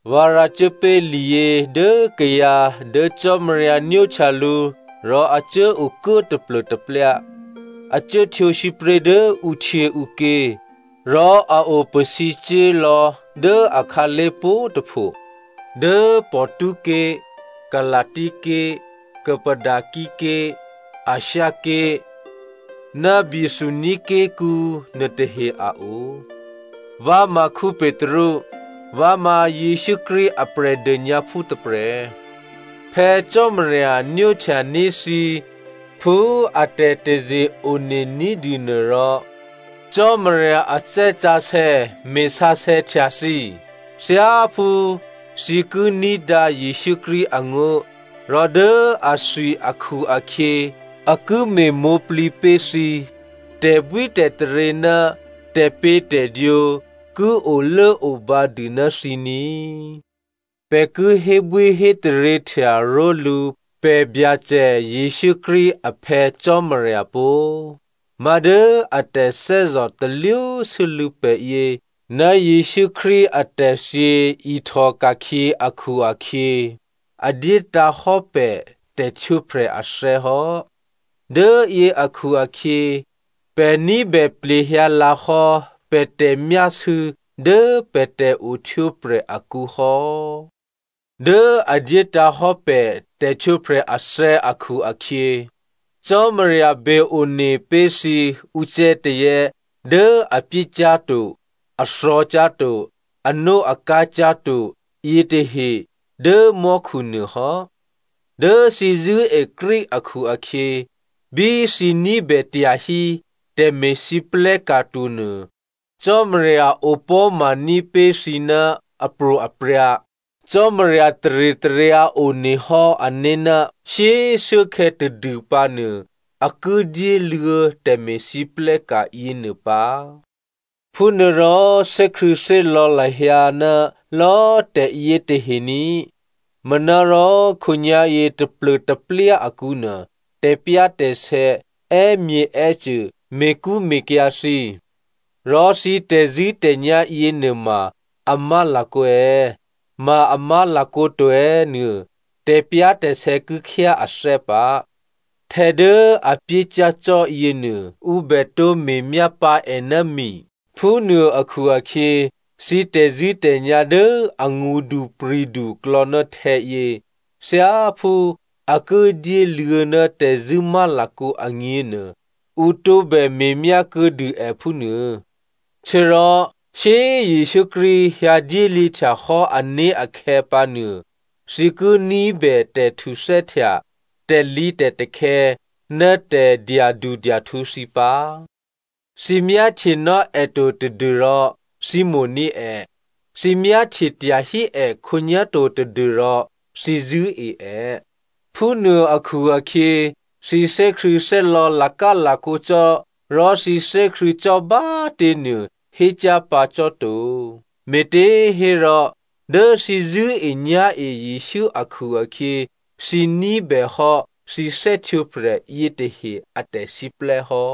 Vǎ rǎcuốpé̤ liyě dố kayǎ dố Cò́marya nwóhtya lǔ rò a cuố okuố taplô̤taplyá, a cuố htwǒ sǐpré̤ dố ǔhtyěǔké̤, rò a o pasǐcuố lò̌ dố akhǎlé̤ pwǒ̤꤮ tôpho dố Pontus ké̤, Galasia ké̤, Cappadocia ké̤, Asia ké̤ ná Bithynia ké̤kǔ nuôtahe a o. Vǎ ma Petru, vǎ ma Jesǔ Krístu a Prè̤dônyǎphú tôprè̤. Phè̌ Cò́marya nwóhtya ní̤ thǐ phú a tè̤taze-one ní̤dûnuô rò Cò́marya a Thè́ Sǎsè̌ me̤sǎsè̌htya thǐ, thyáphú thǐ ki ní̤dǎ Jesǔ Krístu angó̤ rò dố athwi akhu-akhyě a ki me̤mwǒ̤plǐ pé̤ thǐ. Tè̤bwítè̤taryě ná tè̤pě̤tè̤dwǒ ki olốobǎ dû ná thǐ ní꤮. Pè̤ ki hébwíhétaryěhtya ró̤lǔ pè̤ Byacè Jesǔ Krístu a Phè̌ Cò́marya pó꤮. Má̤dố a tè̤thè́zò̤ talwósû́lû̌ pè̤ yě, ná Jesǔ Krístu atè̤thyě ihtòka̤khyě akhu-akhyě, a dyétǎ̤ hò́ pè̤ tè̤htwǒprè̤ athè̌ hò́. Dố yě akhu-akhyě, pè̤ ní̤bè plehyǎ lǎhò́ pè̤ tè̤myásû̌ dố pè̤ tè̤ohtwǒprè̤ akǔ hò́. Dố a dyétǎ̤ hò́ pè̤ tè̤htwǒprè̤ athè̌ akhu-akhyě, Cò́marya be one pé̤ thǐ ucè̌tazè̌ dố a pyécyá̤to, a thò̌cyá̤to, anóakǎ cyá̤to yětahe dố mò́khu nuô hò́. Dố thǐ zṳ̂́e Krístu akhu-akhyě, bí thǐ ní̤bè tyahí tè̤me̤lwóhteka̤ tonuô Cò́marya opò̤́ma ní̤pé̤ thǐ ná apro̤aprya̤. Cò́marya taritaryǎ onehò́ ané̤ ná shyé꤮ shuốkhè̌ tadû pǎnuô, a ki dyéluô̌ tè̤me̤lwóhteka̤ yěnuô pǎ. Phúnuôrò thè́krṳ̂̌thè́lò̌ lahyǎ ná lò̌꤮ tè̤yětahe ní, manárò khǒnyá̤yě taplô̤taplyá akǔnuô tè̤pyá̤tè̤sè̌ è́myěè́cô me̤kṳ́me̤kyǎ̤ thǐ. Rò thǐ tè̤zṳ̂́tè̤nyá̤ yěnuôma a má̤lakǒ è̌, ma a má̤lakǒ to è̌ nuô, tè̤pyá̤tè̤sè̌ ki khyá athè́ pǎ. Htè̌ dố a pyécyá̤ cò́ yěnuô, ǔ bè tǒ me̤myá pǎ è ná mi, phúnuô akhu-akhyě, thǐ tè̤zṳ̂́tè̤nyá̤ dố angṳdupri̤du klò̌ ná htè̌yě, thyáphú a ki dyéluô̌ ná tè̤zṳ̂́ má̤lakǒ agněnuô, ǔ tǒbè me̤myá kuô̌dû è phúnuô. Htuô̌rò shyé꤮ Jesǔ Krístu hyǎ dyéluô̌htya hò́ ané̤ akhè̌ pǎnuô, thǐ ki ní̤bè tè̤htuthè́htya, tè̤lǐtè̤takhè̌ ná tè̤dyadudyahtǔ thǐ pǎ. Thǐ myáhtyenò́ è to tadû́rò thǐ mo̤ní̤ è. Thǐ myáhtye tyahí è khǒnyá̤ to tadû́rò thǐ zṳ̂́e è. Phúnuô akhu-akhyě, thǐ thè́krṳ̂̌thè́lò̌ lakálakǒ cò́ rò thǐ thè́krṳ̂̌ cò́ bá꤮ těnuô hécyá̤ pǎ cò́ to. Me̤těhérò dố thǐ zṳ̂́enyá̤e Jesǔ akhu-akhyě, thǐ ní̤bèhò́ thǐ thè́htwǒprè̤ yětahe a tè̤siplè́ hò́.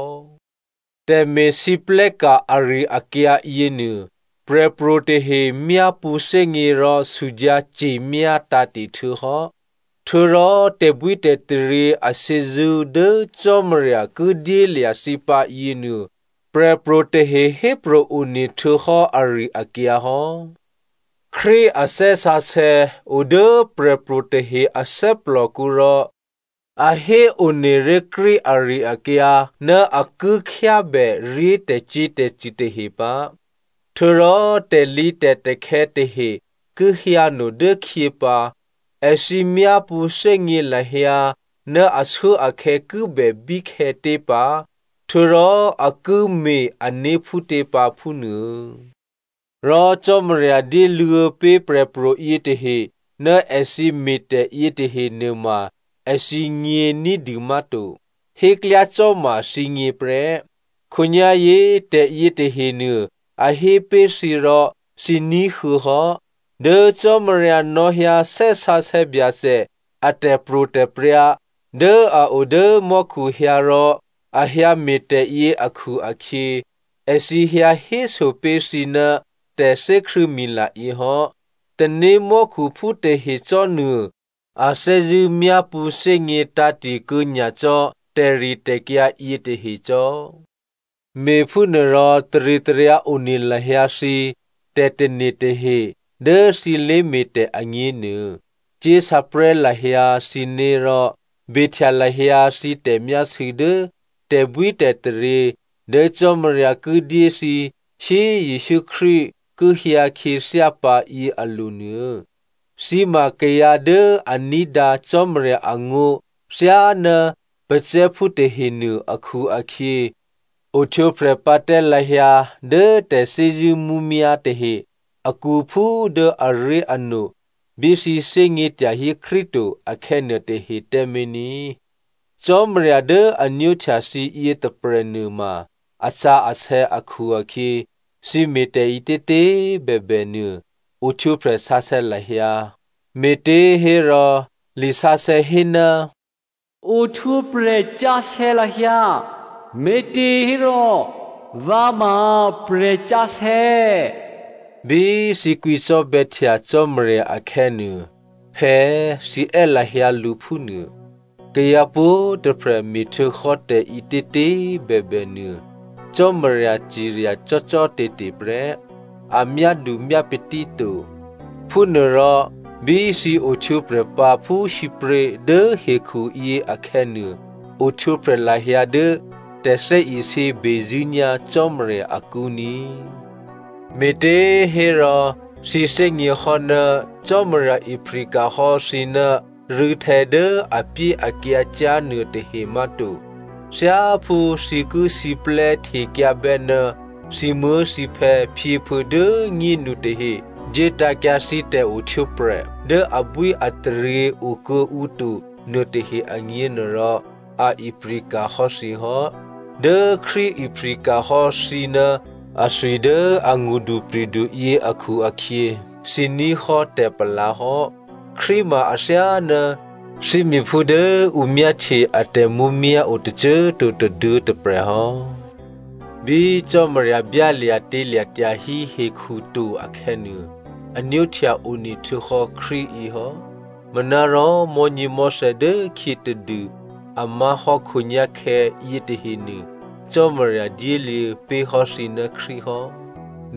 Tè̤me̤lwóhteka̤ ari-akyǎ yěnuô, prè̤pro̤ tahe myápṳ̌thè́gně rò sudyǎ ce̤myá tǎ̤te̤ htuô̌ hò́. Htuô̌rò tè̤bwítè̤taryě ashyězṳ́ dố Cò́marya ki dyélya̤ thǐ pǎ yěnuô, prè̤pro̤ tahe hépro̤ one htuô̌hò́ ari-akyǎ hò́. Krístu a Thè́ Sǎsè̌ o dố prè̤pro̤ tahe a thè́plòkǔ rò a héone ré̤ Krístu ari-akyǎ ná a ki khyábèré̤ tè̤cyě̤tè̤cṳ̂ tahe pǎ, htuô̌rò tè̤lǐtè̤takhè̌ tahe ki hyǎno dố khyě pǎ, èthǐ myápṳ̌ thè́gně lahyǎ ná ashuốakhè̌ ki bè bíkhè̌tě pǎ, htuô̌rò a ki me̤ ané̤ phútě pǎ phúnuô. Rò Cò́marya dyéluô̌ pé̤ prè̤pro̤ yětahe ná èthǐ me̤tè̤ yětahe nuôma èthǐgně ní̤dû má̤to. Héklyácò́ma thǐgně prè́. Khǒnyá̤yě tè̤ yětahenuô a hé pé̤ thǐ rò thǐ ní̤huô̌ hò́. Dố Cò́marya nò̌hyǎ Thè́ Sǎsè̌ Byacè a tè̤pro̤tè̤prya̤ dố a o dố mò́khu hyǎrò, a hyǎ me̤tè̤yě akhu-akhyě, èthǐ hyǎ héso pé̤ thǐ ná tè̤thè́krṳ̂̌mila yě hò́. Tanémò́khuphú tahe cò́ nuô꤮ a thè́zṳ̂́ myápṳ̌thè́gně tǎ̤te̤kuô̌ nyacò́ tè̤ritè̤kyǎ yětahe cò́. Me̤phúnuôrò taritaryǎ one lahyǎ thǐ tè̤tane̤ tahe dố thǐ lé̤me̤tè̤ agněnuô. Cyé̤sǎprè̤́ lahyǎ thǐné̤ rò behtya lahyǎ thǐ tè̤myásû̌ dố tè̤bwítè̤taryě dố Cò́marya ki dyé thǐ shyé꤮ Jesǔ Krístu ki hyǎ khyěthyá pǎ yě alo̤nuô. Thǐ ma kayǎ dố a ní̤dǎ Cò́marya angó̤ thyáná pacè̤̌phú tahenuô akhu-akhyě, ohtwǒprè̤ pǎ tǎ lahyǎ dố tè̤thè́zṳ̂́ mǔmyá̤ tahe akǔ phú dố aré̤ano bí thǐ thè́gně tyahí Krístu to akhè̌nuô tahe tǎmé̤ ní. Cò́marya dố a nwóhtya thǐ yětôprè̤ nuôma asǎsè̌ akhu-akhyě thǐ me̤tè̤ ǐtětě꤮ bèbè nuô, ohtwǒprè̤ sǎsè̌ lahyǎ. Me̤těhérò lisǎsè̌ hé, “Ohtwǒprè̤ sǎsè̌ lahyǎ, me̤těhérò, vǎ ma prè̤sǎsè̌.” Bí thǐ kwǐcò́bè̌htya Cò́marya akhè̌nuô, “Phè̌” thǐ è́ lahyǎ lǔ phúnuô. Kayǎ pwǒ̤꤮ tôprè̤ me̤htuô̌hò́ tè̤ǐtětě꤮ bèbè nuô, Cò́marya cirya cò́cò́te̤te̤ prè́, a myádumyápatí to. Phúnuôrò bí thǐ ohtwǒprè̤ pǎ phú sǐpré̤ dố hekhuyě akhè̌nuô, ohtwǒprè̤ lahyǎ dố tè̤thè́isě bezṳ̂́nyá̤ Cò́marya akǔ ní꤮. Me̤těhérò thǐ thè́gněhò́ ná Cò́marya ipri̤ka̤ hò́ thǐ ná rû̌htè̌ dố apyéakyǎ cyá̤ nuôtahe má̤to. Thyáphú thǐ ki siplè́ htekyǎbè́ ná thǐmuố̤thǐphè̌ phyěphuô̌ dố꤮ nyénu tahe dyétǎ̤kyǎ thǐ tè̤ohtwǒprè̤ dố abwíataryě okuô̌ǔ to nuôtahe agněnuôrò, a ipri̤ka̤ hò́ thǐ hò́. Dố Krístu ipri̤ka̤ hò́ thǐ ná athwi dố angṳdupri̤du yě akhu-akhyě thǐ ní̤ hò́ tè̤palǎ hò́. Krístu ma athyáná thímíphú dố ǔ myáhtye a tè̤mǔmyá̤ o tôcô꤮ to tôduô̌ tôprè̤ hò́. Bí Cò́marya byálya̤tělya̤ tyahí hekhu to akhè̌nuô, a nwóhtya onehtuô̌hò́ Krístu yěhò́. Manárò mò̤́nyěmò̤́thè̌ dố khyě tadû a má̤hò́ khǒnyá̤khè̌ yětahenuô, Cò́marya dyéluô̌ pé̤hò́ thǐ ná Krístu hò́.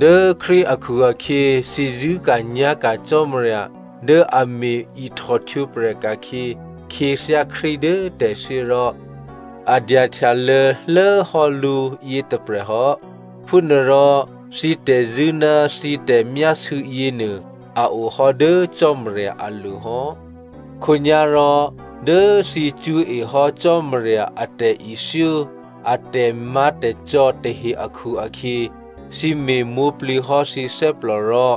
Dố Krístu akhu-akhyě, thǐ zṳ̂́ka̤nyá̤ka̤ Cò́marya dố a me̤ ihtòhtwǒprè̤ ka̤khyě khyěthyá Krístu dố tè̤thyě rò a dyahtyalô̌ lố hò́ lǔ yětôprè̤ hò́. Phúnuôrò thǐ tè̤zṳ̂́ ná thǐ tè̤myásû̌ yěnuô, a o hò́ dố Cò́marya alo̤hò́. Khǒnyá̤rò dố thǐ cṳ̌e hò́ Cò́marya a tè̤ithyó a tè̤má̤tè̤cò́ tahe akhu-akhyě, thǐ me̤mwǒ̤plǐ hò́ thǐ thè́plò rò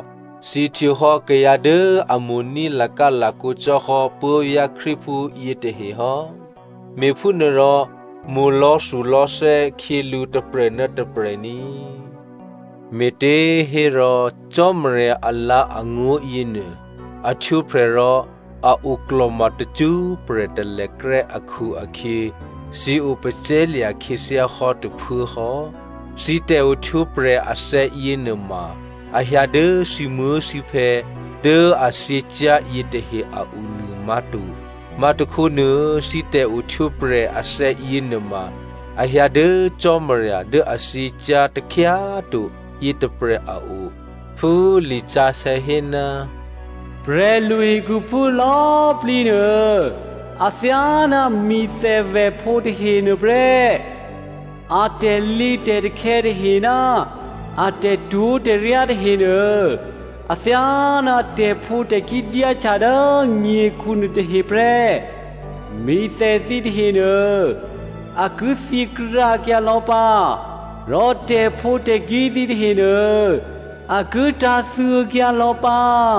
thǐ htwǒ hò́ kayǎ dố a mo̤ní̤ lakálakǒ cò́hò́ puố̤vyá̤ Krístuphú yětahe hò́. Me̤phúnuôrò mo̤ lò̌thulò̌thè́ khyělǔ tôprè̤ ná tôprè̤ ní꤮. Me̤těhérò Cò́marya alǎ̤angó̤ yěnuô, a htwǒprè̤ rò a oklò̤ma tacṳ́prè̤ talèkrè́ akhu-akhyě, thǐ opacè̤̌lya̤ khyěthyá hò́ tôphuố hò́. Thǐ tè̤ohtwǒprè̤ athè̌ yěnuôma, a hyǎ dố thǐmuố̤thǐphè̌ dố a thyěcyá̤ yětahe a o nuô má̤to. Má̤tôkhónuô, thǐ tè̤ohtwǒprè̤ athè̌ yěnuôma, a hyǎ dố Cò́marya dố a thyěcyá̤ takhyá꤮ to yětôprè̤ a o. Phú lisǎsè̌ hé, “Prè̤lu hekhuphú lò̌꤮ plǐ nuô athyáná mi̤thèvèphǒ tahe nuôprè́. A tè̤lǐtè̤takhè̌ tahe ná a tè̤twó̤tè̤ryá tahenuô, athyáná tè̤phǒtè̤kí̤ dyáhtya dố nyekhu nuôtahe prè́. Mi̤thè thǐ tahenuô a ki thyěkrǎkyǎ lò̌ pǎ rò tè̤phǒtè̤kí̤ thǐ tahenuô a ki tǎ̤thyěkyǎ lò̌ pǎ.